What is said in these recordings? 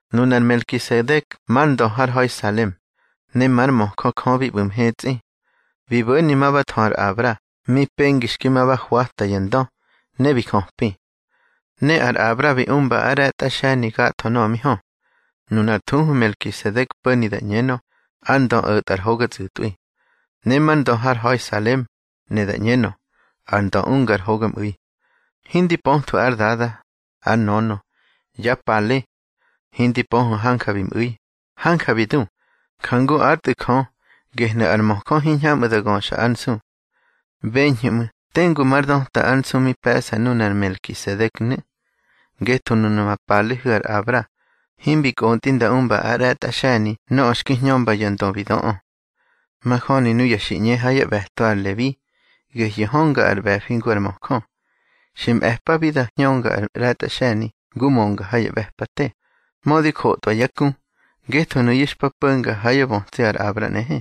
Nunar Melkisedek mar ndö har ha̱i Salem, ne már möjö Jö bi ꞌbu̱ mhetsꞌi. Bi bo̱ni ma ba thö ar Abra mi pengi xki ma ba hwata ya ndö, ne bi jöpi. Ne ar Abra bi umba ár ꞌre̱tꞌa xe̱ni gatho nöꞌö mi hö. Nunar thuhu Melkisedek po̱ni da ꞌñenö, ar ndö o̱tꞌa ar hoga tsꞌu̱tꞌwi. Ne már ndö har ha̱i Salem, ne da ꞌñenö, ar ndö unga ar hogamꞌu̱i. Hindi pöthwu̱ ár dada, ár nönö, yá pale. Hindi pöhu̱ hanja bi mꞌu̱i, hanja bi du, njangu ár Tꞌu̱ Jö, gehnu̱ ar möjö hiñhamꞌu̱ da göxa ár nsu. Beñhu̱ ꞌmu̱ tengu mar döta ár nsu mi pe̱ꞌsa nunar Melkisedeknu̱. Ngetho nuna ma palehu̱ ar Abra, himbi kꞌontꞌi nda umba ár ꞌre̱tꞌa xe̱ni nöꞌö xki hñömba ya ndö bi döꞌö. Majöni nuya xi ꞌñe ha yá ꞌbe̱to ar Lebi, gehyu̱ hönga ar ꞌbe̱fi ngu ar möjö. Xi mꞌe̱pabi da hñönga ár ꞌre̱tꞌa xe̱ni ngu mönga ha ya ꞌbe̱pate, mödi jotꞌwa yá ku, ngetho nuyu̱ xpa po̱nga ha yá bötsi ar Abra nꞌehe.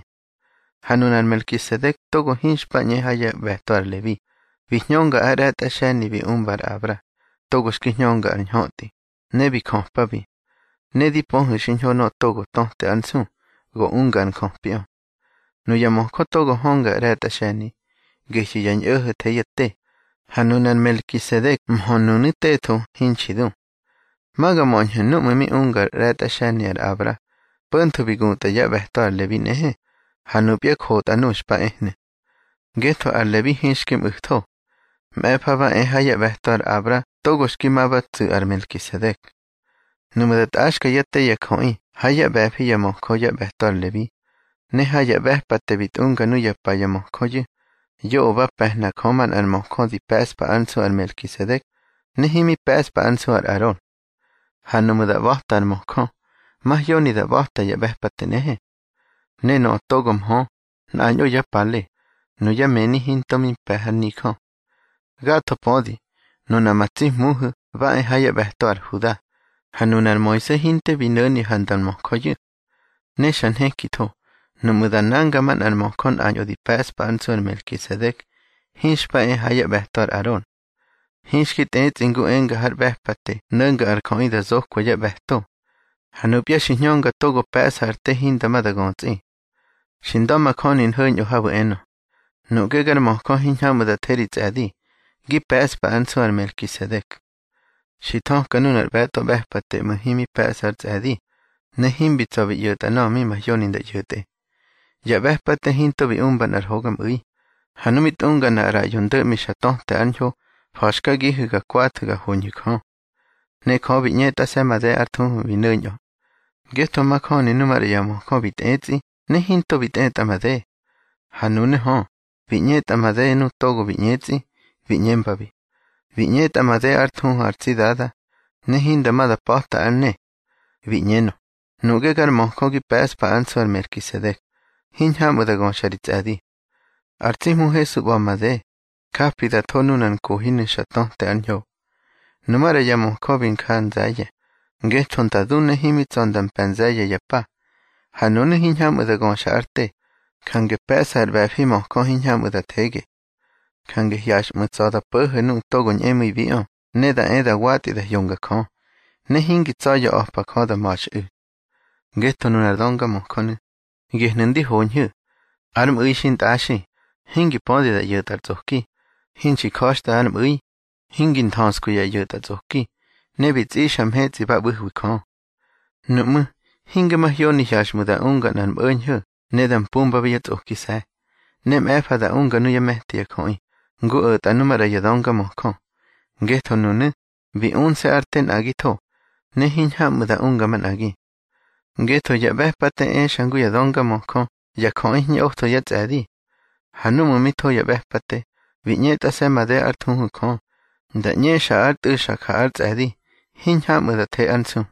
Ha nunar Melkisedek togo hinxpa ꞌñe ha yá ꞌbe̱to ar Lebi, bi hñönga ár ꞌre̱tꞌa xe̱ni bi umba ar Abra, togo xki hñönga ar ñhötꞌi, ne bi jöpabi. Ne di pöhu̱ xiñho nöꞌö togo töte ár nsu, go unga ar njöpiꞌö. Nuya möjö togo hönga ar ꞌre̱tꞌa xe̱ni, gehyu̱ ya ñꞌo̱ho̱ the yá te, ha nunar Melkisedek mhö nunu̱ tetho, hinxi du. Ma ga möñhu̱ núꞌmu̱ mi unga ár ꞌre̱tꞌa xe̱ni ar Abra, po̱ntho bi gutꞌa yá ꞌbe̱to ar Lebi nꞌehe, ha nupya jotꞌa nuꞌu̱ xpa ehnu̱. Ngetho ar Lebi hinxki mꞌu̱tho. Mꞌe̱fa ba e ha yá ꞌbe̱to ar Abra togo xki ma ba tsu̱ ar Melkisedek. Nuꞌmu̱ da tꞌaxka yá te ya jöꞌi ha yá ꞌbe̱fi ya möjö yá ꞌbe̱to ar Lebi, ne ha ya ꞌbe̱pate bi tꞌunga nuyá pa ya möjöyu̱, yoꞌö ba pe̱hna Jö manꞌar möjö di pe̱ꞌspa ár nsu ar Melkisedek, ne himi pe̱ꞌspa ár nsu ar Aron. Ha nuꞌmu̱ da ꞌba̱ta ar möjö, mahyoni da ꞌba̱ta ya ꞌbe̱pate nꞌehe. Ne nöꞌö togo mhö, nꞌañꞌo yá pale, nuyá mëni hinto bi mpe̱ har nijö. Gatho pödi, nuna ma tsi Hmuhu̱ ba e ha yá ꞌbe̱to ar Huda, ha nunar Moise hinte bi no̱ni ha nda nmöjöyu̱. Ne xa nhekitho, nuꞌmu̱ da nanga manꞌar möjö nꞌañꞌo di pe̱ꞌspa ár nsu ar Melkisedek, hinxpa e ha yá ꞌbe̱to ar Aron. Hinxki tꞌetsꞌi ngu enga har ꞌbe̱pate no̱nga ar jöꞌi da zokwa yá ꞌbe̱to. Ha nupya xi hñönga togo pe̱ꞌsa ar te hinda ma da götsꞌi. Xi nda̱majöni nho̱ñꞌö habu̱ enö: Nuꞌge gar möjö hiñhamꞌu̱ da the ri tsꞌe̱di, gi pe̱ꞌspa ár nsu ar Melkisedek. Xi thöka nunar ꞌbe̱tꞌo ꞌbe̱pate ꞌmu̱, himi pe̱ꞌsa ar tsꞌe̱di, ne himbi tsa̱ bi ꞌyo̱tꞌa nöꞌö mi mahyoni nda ꞌyo̱tꞌe. Ya ꞌbe̱pate hinto bi umba nꞌar hogamꞌu̱i, ha nu mi tꞌunga nꞌar ꞌraꞌyo ndo̱ꞌmi xa töte ár ñho, fa̱xkagihu̱ ga kwathu̱ ga hoñhu̱ Jö. Ne Jö bi ꞌñetꞌase̱ made ár thuhu bi no̱ñꞌö. Ngetho majöni nu maꞌra ya möjö bi tꞌetsꞌi ne hinto bi tꞌetꞌa made. Ha nunu̱ hö, bi ꞌñetꞌa made nu togo bi ꞌñetsꞌi, bi ꞌñembabi: Bi ꞌñetꞌa made ár thuhu ar tsi Dada, ne hinda ma da pa̱ta ár ne. Bi ꞌñenö: Nuꞌge gar möjö gi pe̱ꞌspa ár nsu ar Melkisedek, hiñhamꞌu̱ da göxa ri tsꞌe̱di. Ar tsi Hmu Hesu ꞌba̱ made, japi da tho nunar nkohinu̱ xa töte ár ñho. Numaꞌra ya möjö bi nja nze̱ye̱, ngetho nda du ne himi tsa̱ nda mpe̱ nze̱ye̱ ya pa. Ha nunu̱ hiñhamꞌu̱ da göxa ár te, jange pe̱ꞌsa ar ꞌbe̱fi möjö hiñhamꞌu̱ da thege. Jange hyaxꞌmu̱ tsa̱ da po̱ho̱ nuꞌu̱ ñꞌemu̱ibiꞌö ne da e da watꞌi da hyonga Jö, ne hingi tsa̱ya̱ a̱pa Jö da ma̱xꞌu̱. Ngetho nunar döngamöjönu̱, gehnu̱ ndi hoñhu̱: Ár mꞌu̱i xintꞌaxi, hingi pödi da ꞌyo̱tꞌa ar tsꞌoki, hinxi ja̱xtꞌa ár mꞌu̱i, hingi nthöskwi ya ꞌyo̱tꞌatsꞌoki, ne bi tsꞌixa mhetsꞌi ba ꞌbu̱hwi Jö. Nuꞌmú̱, hinge mahyoni hyaxꞌmu̱ da unga nꞌár mꞌo̱ñho̱ ne da mpumbabi yá tsꞌokise̱, ne mꞌe̱fa da unga nuyá me̱ti ya jöꞌi, ngu o̱tꞌa nu maꞌra ya döngamöjö. Ngetho nunu̱, bi unse̱ ár te nꞌagitho, ne hiñhamꞌu̱ da unga manꞌagi. Ngetho ya ꞌbe̱pate exa ngu ya döngamöjö ya jöꞌi hiñꞌotho yá tsꞌe̱di. Ha núꞌmu̱ mi tho ya ꞌbe̱pate, bi ꞌñetꞌase̱ made ár thuhu Jö, nda ꞌñexa ár Tꞌu̱ xa ja ár tsꞌe̱di, hiñhamꞌu̱ da the ár nsu.